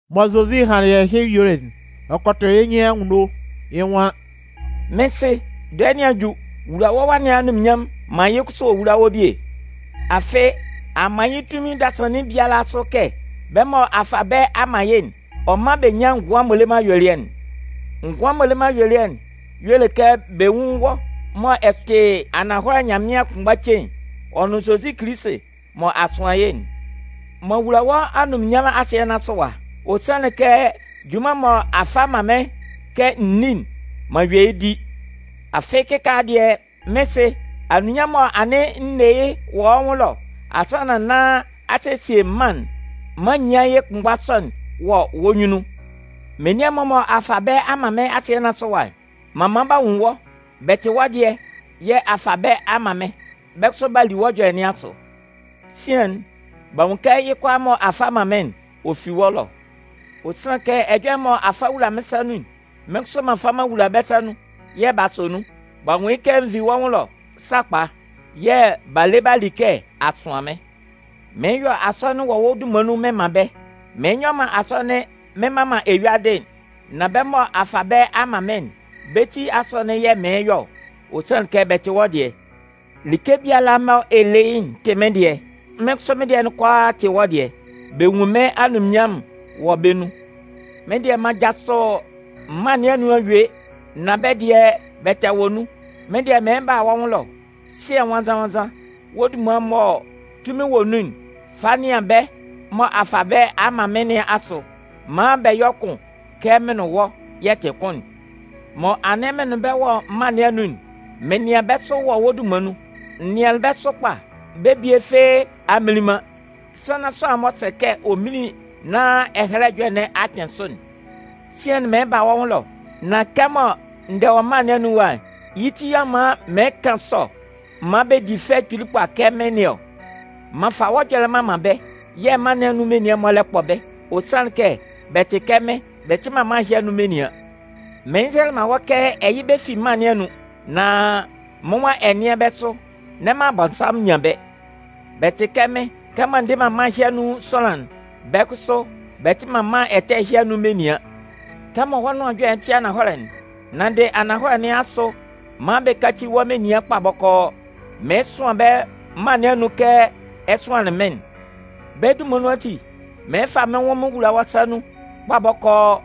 Mɔ Zozi hanlɩn ɛhɩ yuelɩ'n, ɔ kɔ tʋ yɩ́ nyɩn anwunno, yɩ́ nwan: “Mɩ́n Sɩ, dɔɛ nɩn a ju. Wula wɔ́ Wa nɩn anunminnyanmʋn maan yɩ́ kʋsʋ ɔ wúla wɔ́ bie. Afɩ, a man yɩ́ tunmin dasannin biala asʋ kɛ bɛ́ mɔ a fa bɛ́ a man yɩ́'n, ɔ mán bɛ nyán ngʋan m'ɔ le man ayuelɩɛ'n. Ngʋan m'ɔ le man ayuelɩɛ'n, y'ɔ le kɛ bɛ nwún wɔ́ mɔ ɛ tɩ ananhɔlɛ Nyanmɩan'n kʋnmgba cein, ɔ nʋn Zozi Kilisi, mɔ a sʋan yɩ́'n. M'an wula wɔ́ anunminnyanmʋn asɩɛ nɩn asʋ ɛwa. Ɔ sanlɩn kɛ junman'n mɔ a fa a man mɩ́n kɛ n ní'n, m'an yue yɩ́ di. Afɩ kɩkaala dɩɛ, Mɩ́n Sɩ, anunminnyanmʋn'n mɔ anɩn n ne yɩ́ wɔ́ nwʋn ɛlɔ asannan nán a sesie mân'n, maan n nyán yɩ́ kʋnmgba sɔ'n wɔ wɔ́ nyunnun. “Menian'n-mɔ mɔ a fa bɛ́ a man mɩ́n asɩɛ nɩn asʋ ɛwa'n, m'an man b'a nwun wɔ́. Bɛ tɩ wɔ́ dɩɛ, yɛ̂ a fa bɛ́ a man mɩ́n. Bɛ́ kʋsʋ, b'a li wɔ́ ɛjɔlɛ nɩn asʋ. Sian'n, b'a nwun kɛ yɩ́ kʋalaa mɔ a fa a man mɩ́n'n, ɔ fi wɔ́ ɛlɔ. Ɔ sanlɩn kɛ ɛjɔlɛ'n mɔ a fa a wula mɩ́n sa nun'n, mɩ́n kʋsʋ m'an fa m'an wula bɛ́ sa nun, yɛ̂ b'a sɔ nun. B'a nwun yɩ́ kɛ n vi wɔ́ nwʋn ɛlɔ sakpa, yɛ̂ b'a le b'a li kɛ a sʋan mɩ́n. “Mɩɩn yɔ asɔnɩn wɔ wɔ́ dunman nun mɩn man bɛ́. Mɩn nyɔ man asɔnɩn mɩn mman man eyuadɩ'n. Nan bɛ́ mɔ a fa bɛ́ a man mɩ́n'n, bɛ́ ti asɔnɩn yɛ̂ mɩɩn yɔ ɔ. Ɔ sanlɩn kɛ bɛ tɩ wɔ́ dɩɛ. Like biala mɔ ɛ le yɩ́'n tɩ mɩ́n dɩɛ, mɩ́n kʋsʋ mɩ́n dɩɛ'n kʋalaa tɩ wɔ́ dɩɛ. Bɛ nwun mɩ́n anunminnyanmʋn'n wɔ bɛ́ nun. Mɩ́n dɩɛ m'an jasʋ mân nɩn anun a yue, nan bɛ́ dɩɛ, bɛ tɛ wɔ nun. Mɩ́n dɩɛ mɩɩn ba wɔ́ nwʋn ɛlɔ. Sɩɛ Nwannzan-nwannzan, wɔ́ dunman'n mɔ tunmin wɔ nun'n, fa nɩan bɛ́ mɔ a fa bɛ́ a man mɩ́n nɩn asʋ, maan bɛ yɔ́ kʋn kɛ mɩn nʋn wɔ́, yɛ tɩ kʋn'n. Mɔ anɩn mɩn nʋn bɛ́ wɔ mân nɩn anun'n, mɩn nɩan bɛ́ sʋ wɔ wɔ́ dunman nun. N nɩanlɩn bɛ́ sʋ kpa, bɛ́ bie fɩ́ɩ́ a mminlin man, sannan sʋanlan'n m'ɔ sɛ kɛ ɔ mínlin nán Ɛhɛlɛ Ɛjɔlɛ'n nɩn a kpɩn sʋ'n. “Sian'n, mɩɩn ba wɔ́ nwʋn ɛlɔ, nan kɛmɔ n dɛ wɔ mân nɩn anun ɛwa'n, yɩ́ ti yɛ̂ ɔ man mɩɩn kan sɔ maan bɛ di fɛ kpili kpa kɛ mɩ́n nɩn ɔ. M'an fa wɔ́ ɛjɔlɛ'n m'an man bɛ́, yɛ̂ mân nɩn anun menian'n-mɔ lɛ kpɔ bɛ́, ɔ sanlɩn kɛ bɛ tɩ kɛ mɩ́n, bɛ tɩ man mân ɛhɩ anun menian. Mɩɩn nzɛlɛ man wɔ́ kɛ ɛ yɩ́ bɛ́ fi mân nɩn anun, nan mɩ́n nwan ɛ nɩ́an bɛ́ sʋ, n'ɛ man Abɔnsanmʋn nyan bɛ́. Bɛ tɩ kɛ mɩ́n, kɛmɔ n dɩ man mân ɛhɩ anun sʋanlan'n, bɛ́ kʋsʋ, bɛ tɩ man mân ɛtɛ ɛhɩ anun menian. Kɛmɔ wɔ́ nʋan ɛjɔlɛ'n tɩ ananhɔlɛ'n, nanndɩ ananhɔlɛ nɩn asʋ maan bɛ káci wɔ́ menian kpa bɔkɔɔ. Mɩɩn sʋan bɛ́ mân nɩn anun kɛ ɛ sʋanlɩn mɩ́n'n. Bɛ́ dunman nun ati, mɩɩn fa mɩ́n nwʋn mɩn wula wɔ́ sa nun kpa bɔkɔɔ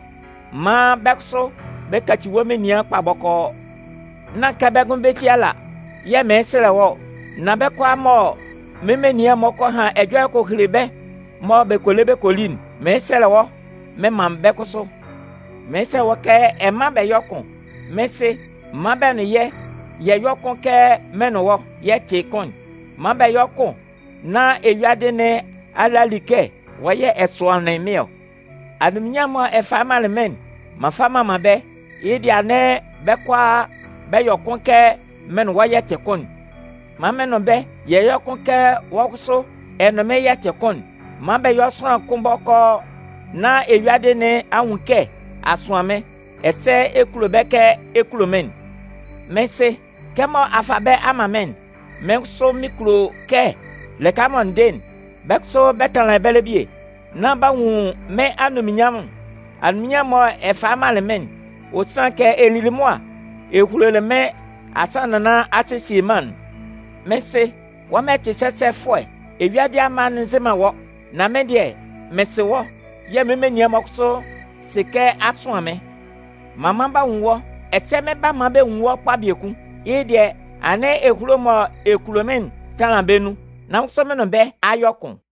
maan bɛ́ kʋsʋ bɛ kaci wɔ́ menian kpa bɔkɔɔ. “Nán kɛ bɛ́ ngʋnmɩn bɛ́ ti ala yɛ̂ mɩɩn sɛlɛ wɔ́ ɔ, nan bɛ́ kʋalaa mɔ mɩ́n menian'n-mɔ kɔ han ɛjɔlɛ kɔ hele bɛ́ mɔ bɛ kɔ le bɛ kɔ li'n, mɩɩn sɛlɛ wɔ́ mɩn man bɛ́ kʋsʋ. Mɩɩn sɛlɛ wɔ́ kɛ ɛ mán bɛ yɔ́ kʋn. Mɩ́n Sɩ, man bɛ nʋn yɛ́, yɛ yɔ́ kʋn kɛ mɩn nʋn wɔ́, yɛ tɩ kʋn'n. Man bɛ yɔ́ kʋn nán eyuadɩ nɩn a le a li kɛ wɔ́ yɛ̂ ɛ sʋanlɩn mɩ́n ɔ. Anunminnyanmʋn'n mɔ ɛ falɩ manlɩn mɩ́n'n, m'an fa m'an man bɛ́, yɩ́ dɩɛ anɩn bɛ́ kʋalaa bɛ yɔ kʋn kɛ mɩn nʋn wɔ́ yɛ tɩ kʋn'n. Man mɩn nʋn bɛ́, yɛ yɔ́ kʋn kɛ wɔ́ kʋsʋ ɛ nʋn mɩ́n, yɛ tɩ kʋn'n. Man bɛ yɔ́ sʋanlan kʋn bɔkɔɔ, nán eyuadɩ nɩn a nwun kɛ a sʋan mɩ́n, ɛsɛ ɛ kulo bɛ́ kɛ ɛ kulo mɩ́n'n. “Mɩ́n Sɩ, kɛmɔ a fa bɛ́ a man mɩ́n'n, mɩ́n kʋsʋ mɩn kulo kɛ lɩka mɔ n dɩ'n, bɛ́ kʋsʋ bɛ tanlan ɛbɛlɛ bie, nán b'a nwun mɩ́n anunminnyanmʋn'n, anunminnyanmʋn'n mɔ ɛ falɩ manlɩn mɩ́n'n. Ɔ sanlɩn kɛ ɛ lili mʋa ɛ hulolɩ mɩ́n asannan nán a sesie mân'n. Mɩ́n Sɩ, wɔ́ mɔ ɛ tɩ sɛsɛfʋɛ, eyuadɩ amma'n nzɩ man wɔ́, nan mɩ́n dɩɛ, mɩn sɩ wɔ́. Yɛ̂ mɩ́n menian'n-mɔ kʋsʋ sɩ kɛ a sʋan mɩ́n. M'an man b'a nwun wɔ́, ɛsɛ mɩn 'ba man bɛ nwun wɔ́ kpa biekun. Yɩ́ dɩɛ, anɩn ehulo'n mɔ ɛ kulo mɩ́n'n tanlan bɛ nun, nán mɩ́n kʋsʋ mɩn nʋn bɛ́ a yɔ kʋn.”